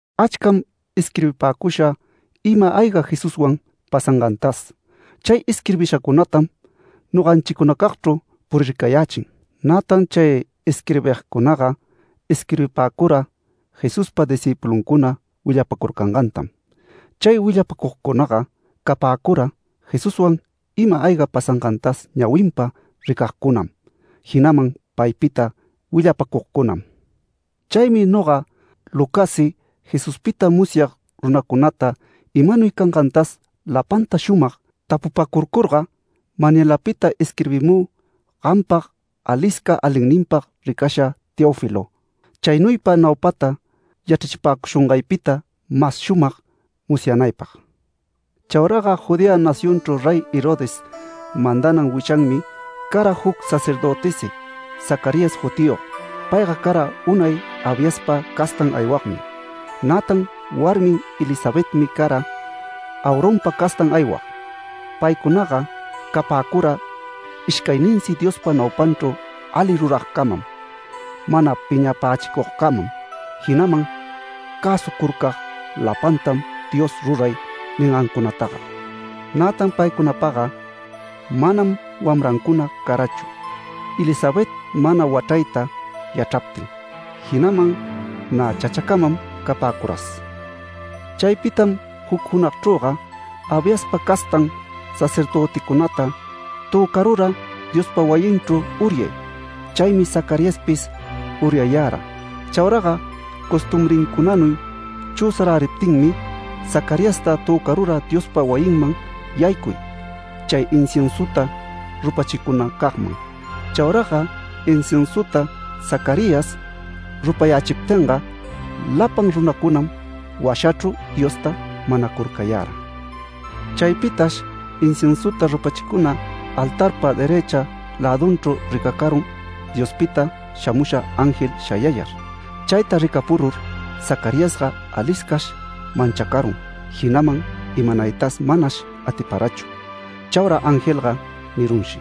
Achcam isquirbipäcusha ima-ayga Jesuswan pasangantas. Chay isquirbishacunatam noganchicunacagchru purircayächin. Nätan chay isquirbigcunaga isquirbipäcura Jesuspa discïpuluncuna willapacurcangantam. Chay willapacugcunaga capäcura Jesuswan ima-ayga pasangantas ñawinpa ricagcunam, jinaman paypita willapacugcunam. Chaymi noga, Lucassi Jesuspita musyag runacunata imanuy cangantas lapanta shumag tapupacurcurga, manyalapita isquirbimü gampag, alisca alinninpag ricasha Teófilo, chaynuypa naupata yachrachipäcushungaypita mas shumag musyanaypag. Chauraga Judea nacionchru Rey Herodes mandanan wichanmi, cara juc sacerdötisi Zacarías jutiyog. Payga cara unay Abiaspa castan aywagmi, nätan warmin Elisabetmi cara Aaronpa castan aywag. Paycunaga capäcura ishcayninsi Diospa naupanchru ali ruragcamam, mana piñapächicugcamam, jinaman cäsucurcag lapantam Dios ruray ningancunataga. Nätan paycunapaga manam wamrancuna carachu, Elisabet mana wachrayta yachraptin, jinaman nä chachacamam capäcuras. Chaypitam juc junagchrüga, Abiaspa castan sacerdöticunata töcarura Diospa wayinchru uryay. Chaymi Zacariaspis uryayara. Chauraga costumbrincunanuy chüsaräriptinmi Zacariasta töcarura Diospa wayinman yaycuy, chay inciensuta rupachicunacagman. Chauraga inciensuta Zacarías rupayächiptinga, lapan runacunam washachru Diosta manacurcayara. Chaypitash inciensuta rupachicuna altarpa derëcha lädunchru ricacarun Diospita shamusha ángel shayayar. Chayta ricapurur Zacariasga aliscash manchacarun, jinaman imanaytas manash atiparachu. Chaura angelga nirunshi: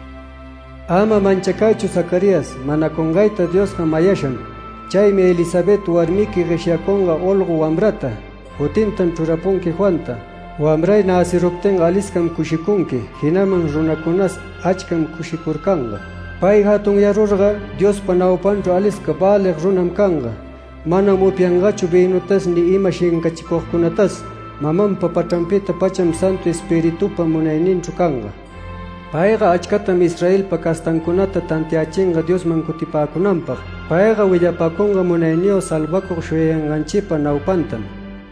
“¡Ama manchacaychu Zacarías! Manacungayta Diosga mayasham. Chaymi Elisabet warmiqui gueshyacunga olgo wamrata. Jutintam chrurapunqui Juanta. Wamray näciruptinga aliscam cushicunqui, jinaman runacunas achcam cushicurcanga. Pay jatunyarurga, Diospa naupanchru alisca välig runam canga. Manam upyangachu vïnutas ni ima shincachicugcunatas. Mamanpa pachranpita-pacham Santu Espiritupa munayninchru canga. Payga achcatam Israelpa castancunata tantiachinga Diosman cutipäcunanpag. Payga willapacunga munayniyog salvacug shuyayanganchipa naupantam.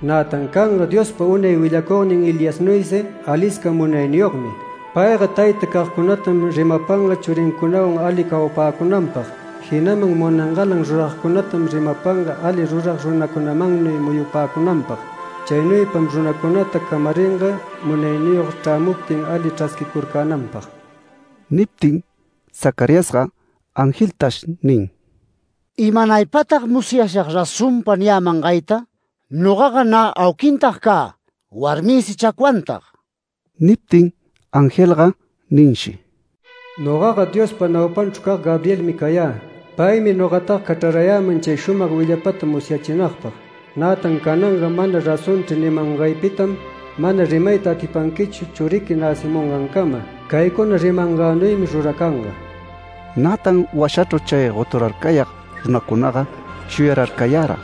Nätan canga Diospa unay willacugnin Eliasnuysi, alisca munayniyogmi. Payga tayta cagcunatam rimapanga churincunawan ali cawapäcunanpag, jinaman munangalan ruragcunatam rimapanga ali rurag runacunamannuy muyupäcunanpag. Chaynuypam runacunata camaringa, munayniyog chrämuptin ali chrasquicurcänanpag”. Niptin Zacariasga angeltash nin: “¿Imanaypatag musyashag razonpa niyämangayta? Nogaga nä auquintag cä, warmïsi chacwantag”. Niptin angelga ninshi: “Nogaga Diospa naupanchru cag Gabrielmi cayä. Paymi nogataga cachrarayäman chay shumag willapata musyachinagpag. Nätan cananga ‘Mana razonchri’ nimangaypitam, mana rimayta atipanquichu churiqui näcimungancama. Caycuna rimangänuymi ruracanga”. Nätan washachru chay goturarcayag runacunaga shuyararcayara,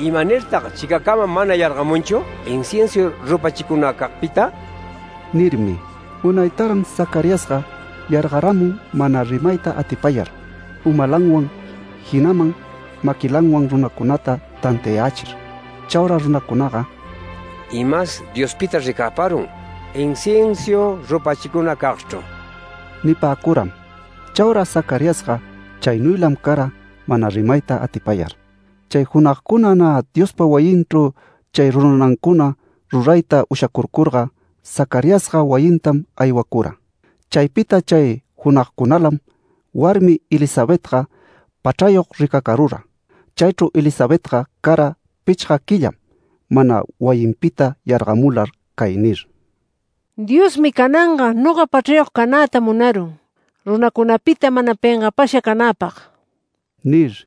“¿Imanirtag chicacama mana yargamunchu inciensu rupachicunacagpita?” nirmi. Unaytaran Zacariasga yargaramun mana rimayta atipayar, umalanwan, jinaman maquilanwan runacunata tantiayächir. Chaura runacunaga “Imas Diospitachr ricäparun inciensu rupachicunacagchru” nipäcuram. Chaura Zacariasga chaynuylam cara mana rimayta atipayar. Chay junagcuna nä Diospa wayinchru chay ruranancuna rurayta ushacurcurga, Zacariasga wayintam aywacura. Chaypita chay junagcunalam warmin Elisabetga pachrayog ricacarura. Chaychru Elisabetga cara pichga quillam mana wayinpita yargamular cay nir: “Diosmi cananga noga pachrayog canäta munarun, runacunapita mana pengapasha canäpag” nir.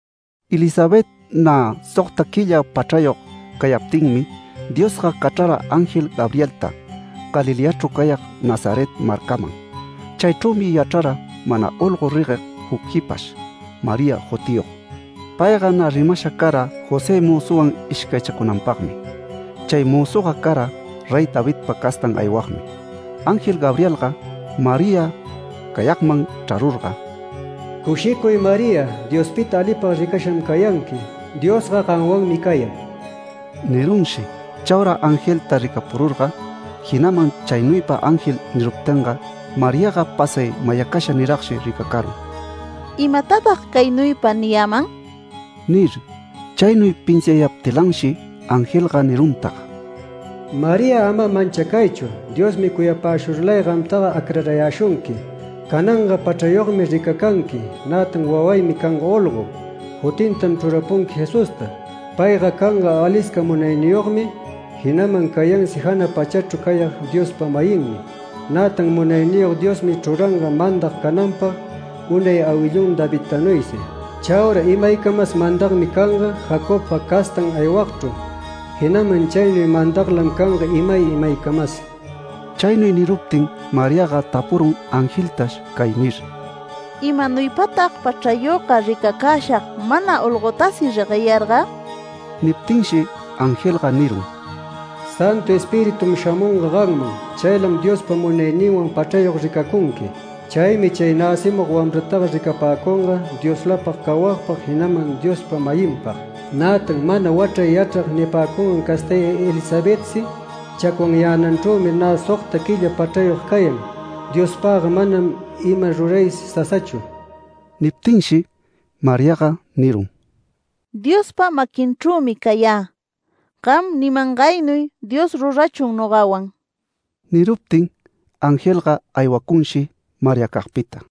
Elisabet nä sogta quilla pachrayog cayaptinmi, Diosga cachrara ángel Gabrielta Galileachru cayag Nazaret marcaman. Chaychrümi yachrara mana olgo regueg juc jipash, María jutiyog. Payga nä rimasha cara José mözuwan ishcaychacunanpagmi. Chay mözuga cara Rey Davidpa castan aywagmi. Angel Gabrielga María cayagman chrarurga “¡Cushicuy María! Diospita alipag ricasham cayanqui. Diosga gamwanmi cayan” nirunshi. Chaura angelta ricapururga, jinaman chaynuypa ángel niruptinga, Mariaga pasay mayacasha niragshi ricacarun, “¿Imatatag caynuypa niyäman?” nir. Chaynuy pinsiayaptilanshi angelga niruntag: “María, ama manchacaychu. Diosmi cuyapäshurlay gamtaga acrarayäshunqui. Cananga pachrayogmi ricacanqui, nätan wawaymi canga olgo. Jutintam chrurapunqui Jesusta. Payga canga alisca munayniyogmi, jinaman cayansi jana pachachru cayag Diospa-mayinmi. Nätan Munayniyog Diosmi chruranga mandag cananpag, unay awillun Davidtanuysi. Chaura imaycamas mandagmi canga Jacobpa castan aywagchru, jinaman chaynuy mandaglam canga imay imaycamas”. Chaynuy niruptin Mariaga tapurun angeltash cay nir: “¿Imanuypatag pachrayogga ricacäshag mana olgotasi regueyarga?” Niptinshi angelga nirun: “Santu Espiritum shamunga gamman. Chaylam Diospa munayninwan pachrayog ricacunqui. Chaymi chay näcimug wamrataga ricapäcunga Dioslapag cawagpag, jinaman Diospa-mayinpag. Nätan mana wachray yachrag nipäcungan castay Elisabetsi chacwanyänanchrümi nä sogta quilla pachrayog cayan. Diospagga manam ima ruraysi sasachu”. Niptinshi Mariaga nirun: “Diospa maquinchrümi cayä. Gam nimangaynuy Dios rurachun nogawan”. Niruptin, angelga aywacunshi Mariacagpita.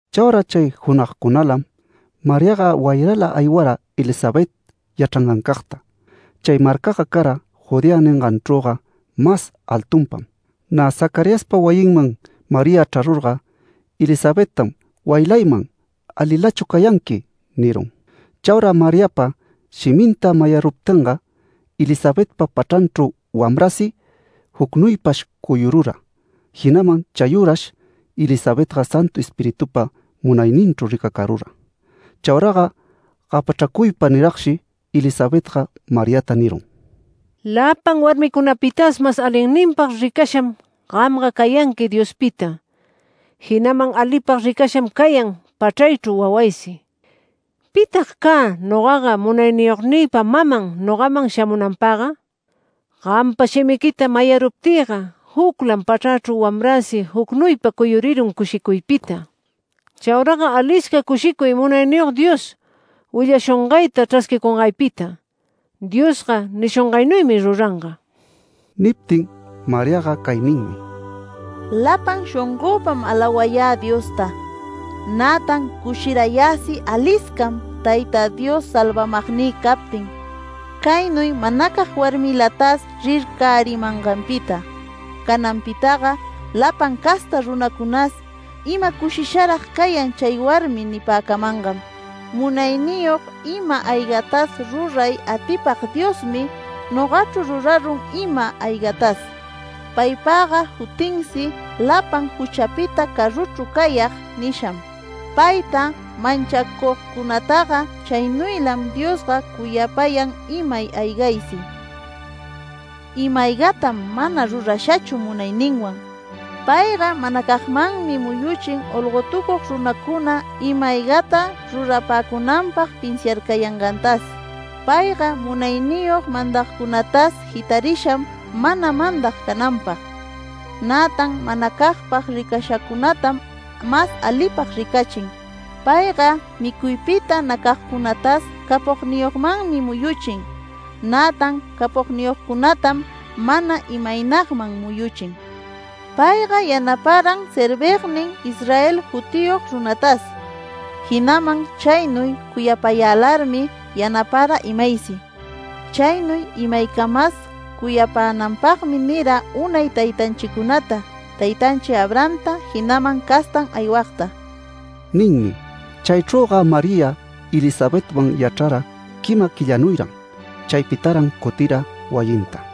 Chaura chay junagcunalam, Mariaga wayrala aywara Elisabet yachrangancagta. Chay marcaga cara Judea ninganchrüga mas altunpam. Nä Zacariaspa wayinman María chrarurga, Elisabettam “Wayilayman. ¿Alilachu cayanqui?” nirun. Chaura Mariapa shiminta mayaruptinga, Elisabetpa pachranchru wamrasi jucnuypash cuyurura, jinaman chayürash Elisabetga Santu Espiritupa munayninchru ricacarura. Chauraga gapachracuypa niragshi Elisabetga Mariata nirun: “Lapan warmicunapitas mas alinninpag ricasham gamga cayanqui Diospita, jinaman alipag ricasham cayan pachraychru wawaysi. ¿Pitag cä nogaga Munayniyognïpa maman nogaman shamunanpagga? Gampa shimiquita mayaruptïga, juclam pachrächru wamräsi jucnuypa cuyurirun cushicuypita. Chauraga alisca cushicuy Munayniyog Dios willashungayta chrasquicungaypita, Diosga nishungaynuymi ruranga”. Niptin Mariaga cay ninmi: “Lapan shongöpam alawayä Diosta, Nätan cushirayäsi aliscam Tayta Dios salvamagnï captin, caynuy manacag warmilatas rircärimanganpita. Cananpitaga lapan casta runacunas ‘Ima cushisharag cayan chay warmi’ nipäcamangam. Munayniyog ima-aygatas ruray atipag Diosmi nogachru rurarun ima-aygatas. Paypagga jutinsi ‘Lapan juchapita caruchru cayag’ nisham. Payta manchacugcunataga chaynuylam Diosga cuyapayan imay aygaysi. Ima-aygatam mana rurashachu munayninman. Payga manacagmanmi muyuchin olgotucug runacuna ima-aygata rurapäcunanpag pinsiarcayangantas. Payga munayniyog mandagcunatas jitarisham mana mandag cananpag. Nätan manacagpag ricashacunatam mas alipag ricachin. Payga micuypita nacagcunatas capogniyogmanmi muyuchin, nätan capogniyogcunatam mana imaynagman muyuchin. Payga yanaparam servignin Israelta jutiyog runatas. Jinaman chaynuy cuyapayälarmi yanapara imaysi. Chaynuy imaycamas cuyapänanpagmi nira unay taytanchicunata, taytanchi Abrahamta, jinaman castan aywagta” ninmi. Chaychrüga María, Elisabetwan yachrara quima quillanuyran. Chaypitaran cutira wayinta.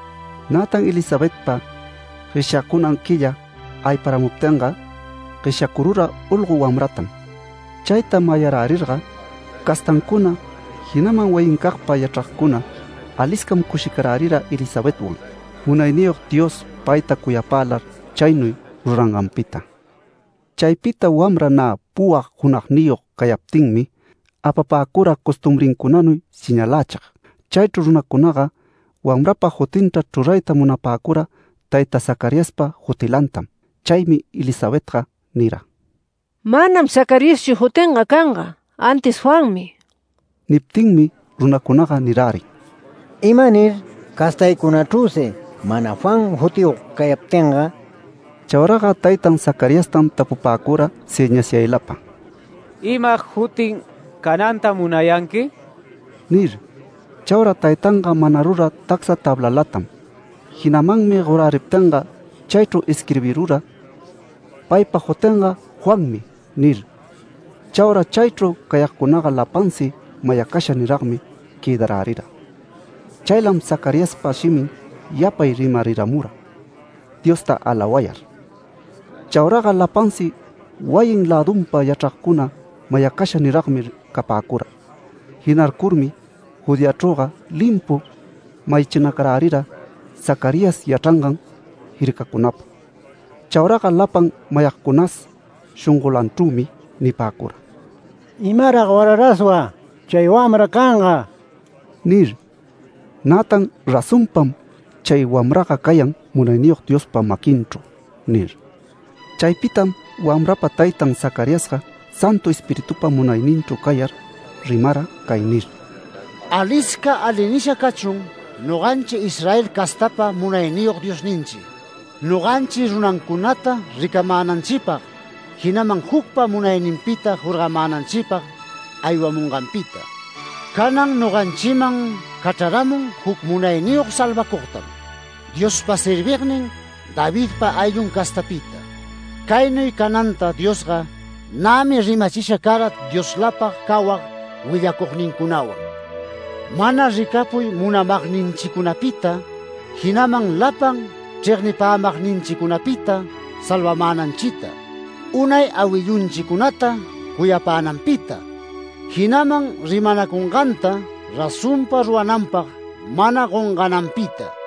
Nätan Elisabetpa gueshyacunan quilla ayparamuptinga, gueshyacurura olgo wamratam. Chayta mayarärirga castancuna, jinaman wayincagpa yachragcuna aliscam cushicarärira Elisabetwan, Munayniyog Dios payta cuyapälar, chaynuy ruranganpita. Chaypita wamra nä puwag junagniyog cayaptinmi, apapäcura costumbrincunanuy señalächig. Chaychru runacunaga wamrapa jutinta chrurayta munapäcura taytan Zacariaspa jutilantam. Chaymi Elisabetga nira: “Manam Zacariaschu jutinga canga, antis Juanmi”. Niptinmi runacunaga nirärin: “¿Imanir? Castaycunachrüsi mana ‘Juan’ jutiyog cayaptinga”. Chauraga taytan Zacariastam tapupäcura sëñasyaylapa: “¿Ima jutin canantam munayanqui?” nir. Chaura taytanga manarura tacsa tablalatam, jinamanmi goräriptinga chaychru isquirbirura: “Paypa jutinga Juanmi” nir. Chaura chaychru cayagcunaga lapansi mayacasha niragmi quëdarärira. Chaylam Zacariaspa shimin yapay rimariramura, Diosta alawayar. Chauraga lapansi wayin lädunpa yachragcuna mayacasha niragmi capäcura. Jinarcurmi Judeachrüga limpu mayachinacarärira Zacarías yachrangan jircacunapa. Chauraga lapan mayacugcunas shongolanchrümi nipäcura: “¿Imarag wara raswa chay wamra canga?” nir. Nätan “Razonpam chay wamraga cayan Munayniyog Diospa maquinchru” nir. Chaypitam wamrapa taytan Zacariasga Santu Espiritupa munayninchru cayar rimara cay nir: “Alisca ali nisha cachun noganchi Israel castapa Munayniyog Diosninchi, noganchi runancunata ricamänanchipag, jinaman jucpa munayninpita jorgamänanchipag aywamunganpita. Canan noganchiman cachraramun juc munayniyog salvacugtam, Diospa servignin Davidpa ayllun castapita. Caynuy cananta Diosga nämi rimachisha cara Dioslapag cawag willacugnincunawan, Mana ricapuy munamagninchicunapita, jinaman lapan chregnipämagninchicunapita salvamänanchita; Unay awillunchicunata cuyapänanpita, jinaman rimanacunganta razonpa rurananpag mana gongananpita.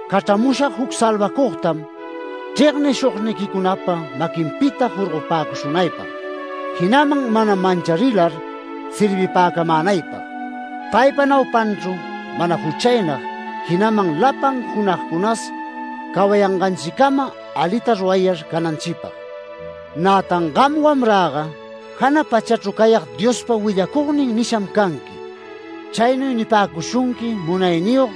‘Cachramushag juc salvacugtam chregnishugniquicunapa maquinpita jorgopäshunaypag, jinaman mana mancharilar servipacamänaypag’. Paypa naupanchru mana juchaynag, jinaman lapan junagcunas cawayanganchicama alita rurayar cananchipag. Nätan gam, wamräga, jana pachachru cayag Diospa willacugnin nisham canqui. Chaynuy nipäcushunqui munayniyog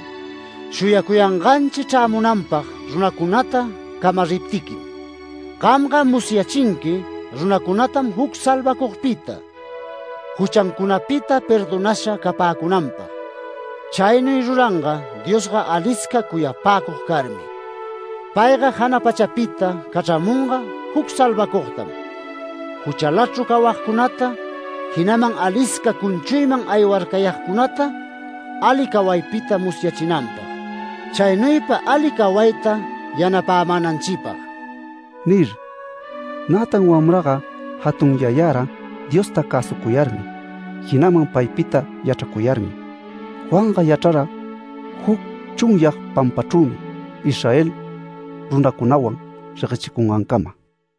shuyacuyanganchi chrämunanpag runacunata camariptiquim. Gamga musyachinqui runacunatam juc salvacugpita, juchancunapita perdonasha capäcunanpag. Chaynuy ruranga Diosga alisca cuyapäcug carmi. Payga jana pachapita cachramunga juc salvacugtam, juchalachru cawagcunata, jinaman alisca cunchuyman aywarcayagcunata ali cawaypita musyachinanpag, chaynuypa ali cawayta yanapämänanchipag” nir. Nätan wamraga jatunyayara Diosta cäsucuyarmi, jinaman paypita yachracuyarmi. Juanga yachrara juc chunyag pampachrümi Israel runacunawan reguechicungancama.